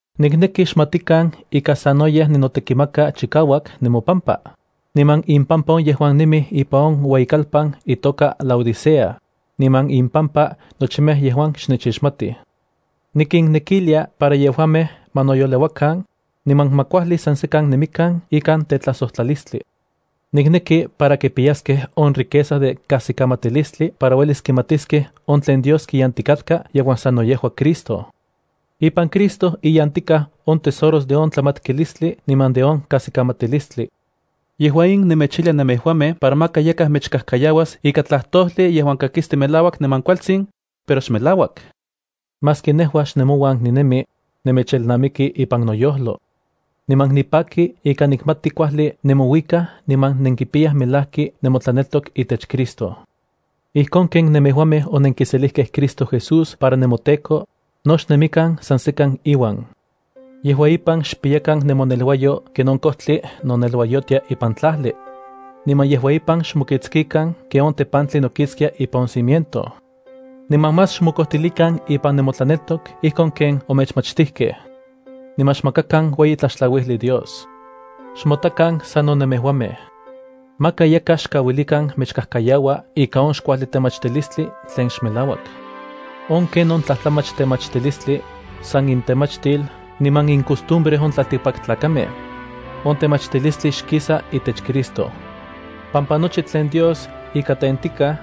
Nikneki xmatikan ika sanoyej ninotekimaka chikauak nemopampa, niman impampa on yejuan nemij ipan on ueyikalpan itoka Laodicea, niman impampa nochimej yejuan xnechixmatij. Nikinnekilia para yejuamej ma noyoleuakan, niman ma kuajli san sekan nemikan ikan tetlajsojtlalistli. Nikneki para kipiyaskej on riqueza de kajsikamatilistli para uelis kimatiskej on tlen Dios kiyantikatka yejuan sano yejua Cristo. Ipan Cristo iyantikaj on tesoros de on tlamatkilistli niman de on kajsikamatilistli. Yejua in nemechijlia nemejuamej para maka yakaj mechkajkayauas ika tlajtojli yejuan kakisti melauak niman kualtsin, pero xmelauak. Maski nejua xnemouan ninemi, nemechelnamiki ipan noyojlo. Niman nipaki ika nikmati kuajli nemouikaj niman nenkipiyaj melajki nemotlaneltok itech Cristo. Ijkon ken nemejuamej onenkiselijkej Cristo Jesús para nemoTEKO, no xnemikan san sekan iuan. Yejua ipan xpiyakan nemoneluayo ken on kojtli noneluayotia ipan tlajli. Niman yejua ipan xmokiktsikan ken on tepantli nokiktsia ipan on cimiento. Niman más xmokojtilikan ipan nemotlaneltok ijkon ken omechmachtijkej. Niman xmakakan ueyi tlaxtlauijli Dios. Xmotakan sano nemejuamej. Maka yakaj xkauilikan mechkajkayaua ika on xkuajli temachtilistli tlen xmelauak. On ken on tlajtlamach temachtilistli, san intemachtil niman incostumbre on tlaltikpaktlakamej. On temachtilistli xkisa itech Cristo, pampa nochi tlen Dios ika tentikaj,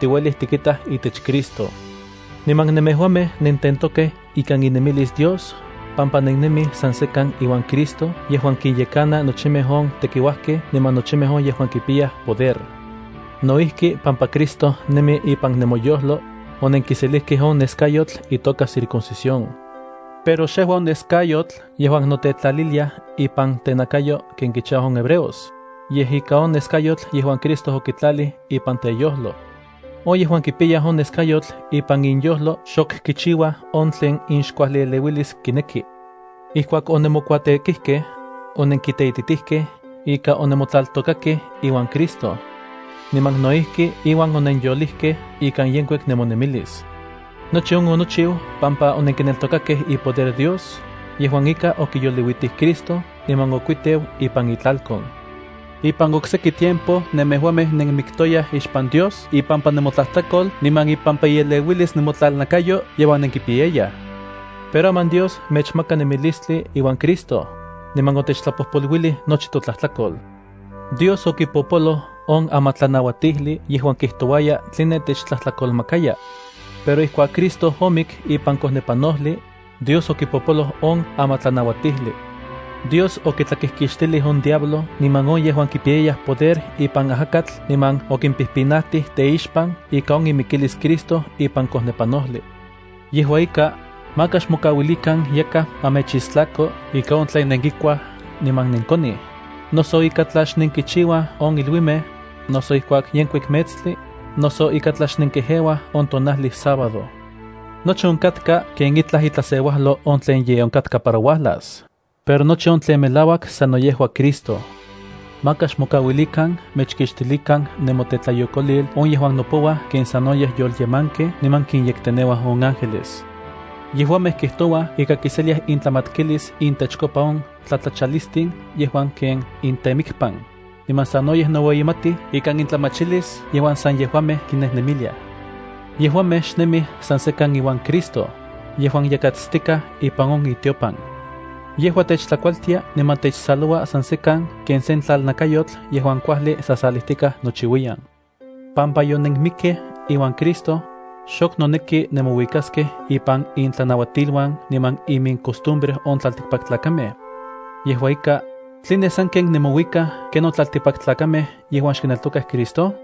tiuelij tikitaj itech Cristo. Niman nemejuamej nententokej ikan inemilis Dios pampa nennemij san sekan iuan Cristo yejuan kinyekana nochimej on tekiuajkej niman nochimej on yejuan kipiyaj poder. No ijki pampa Cristo nemi ipan nemoyojlo, onenkiselijkej on neskayotl itoka circuncisión. Pero xejua on neskayotl yejuan notetlalilia ipan tenakayo ken kichiuaj on hebreos, yej ika on neskayotl yejuan Cristo okitlalij ipan teyojlo. On yejuan kipiyaj on neskayotl ipan inyojlo xok kichiuaj on tlen inxkuajli eleuilis kineki. Ijkuak onemokuatekijkej, onenkiteititijkej ika onemotlaltôkakej iuan Cristo. Niman no ijki iuan onenyolijkej ikan yenkuik nemonemilis. Nochi on onochiu pampa onenkineltokakej ipoder Dios yejuan ika okiyoliuitij Cristo niman okuiteu ipan itlalkon. Ipan okseki tiempo nemejuamej nenmiktoyaj ixpan Dios ipampa nemotlajtlakol niman ipampa ieleuilis nemotlalnakayo yejuan nenkipiyayaj. Pero aman Dios mechmaka nemilistli iuan Cristo, niman otechtlapojpoluilij nochi totlajtlakol. Dios okipopoloj on amatlanauatijli yejuan kijtouaya tline techtlajtlakolmakaya. Pero ijkuak Cristo omik ipan kojnepanojli, Dios okipopoloj on amatlanauatijli. Dios okitlakijkixtilij on diablo niman on yejuan kipiyayaj poder ipan ajakatl niman okimpijpinajtij teixpan ika on imikilis Cristo ipan kojnepanojli. Yejua ika, maka xmokauilikan yakaj ma mechistlako ika on tlen nenkikuaj niman nenkonij, noso ika tla xnenkichiuaj on iluimej, noso ijkuak yenkuik metstli, noso ika tla xnenkejeuaj on tonajli sábado. Nochi onkatka ken itlaj itlaseuajlo on tlen ye onkatka para uajlas, pero nochi on tlen melauak sano yejua Cristo. Maka xmokauilikan mechkixtilikan nemotetlayokolil on yejuan nopouaj ken sanoyej yolyemankej niman kinyekteneuaj on ángeles. Yejuamej kijtouaj ika kiseliaj intlamatkilis intechkopa on tlatlachalistin yejuan ken intemikpan, niman sanoyej noueyimatij ikan intlamachilis yejuan san yejuamej kinemiliaj. Yejuamej xnemij san sekan iuan Cristo, yejuan yakatstikaj ipan on itiopan. Yejua techtlakualtia niman techsaloua san sekan ken sen tlalnakayotl yejuan kuajli sajsalijtikaj nochiuiyan. Pampa yonenmikkej iuan Cristo, xok noneki nemouikaskej ipan intlanauatiluan niman imincostumbre on tlaltikpaktlakamej. Yejua ika, ¿tline sanken nemouikaj ken on tlaltikpaktlakamej yejuan xkineltokaj Cristo?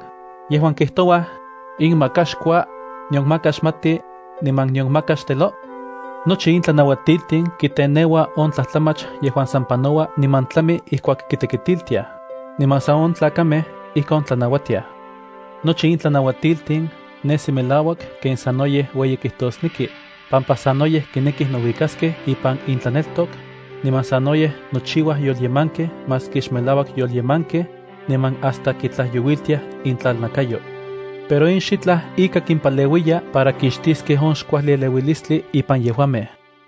yejuan kijtouaj: “In maka xkua, nion maka xmati, niman nion maka xtelo”? Nochi in tlanauatiltin kiteneua on tlajtlamach yejuan san panoua niman tlami ijkuak kitekitiltiaj, niman san on tlakamej ijkon tlanauatiaj. Nochi in tlanauatiltin nesi melauak ken sanoyej ueyi kijtosneki, pampa sanoyej kinekij nouikaskej ipan intlaneltok, niman sanoyej nochiuaj yolyemankej maski xmelauak yolyemankej, niman hasta kitlajyouiltiaj intlalnakayo. Pero in xitlaj ika kimpaleuiya para kixtiskej on xkuajli eleuilistli ipan yejuamej.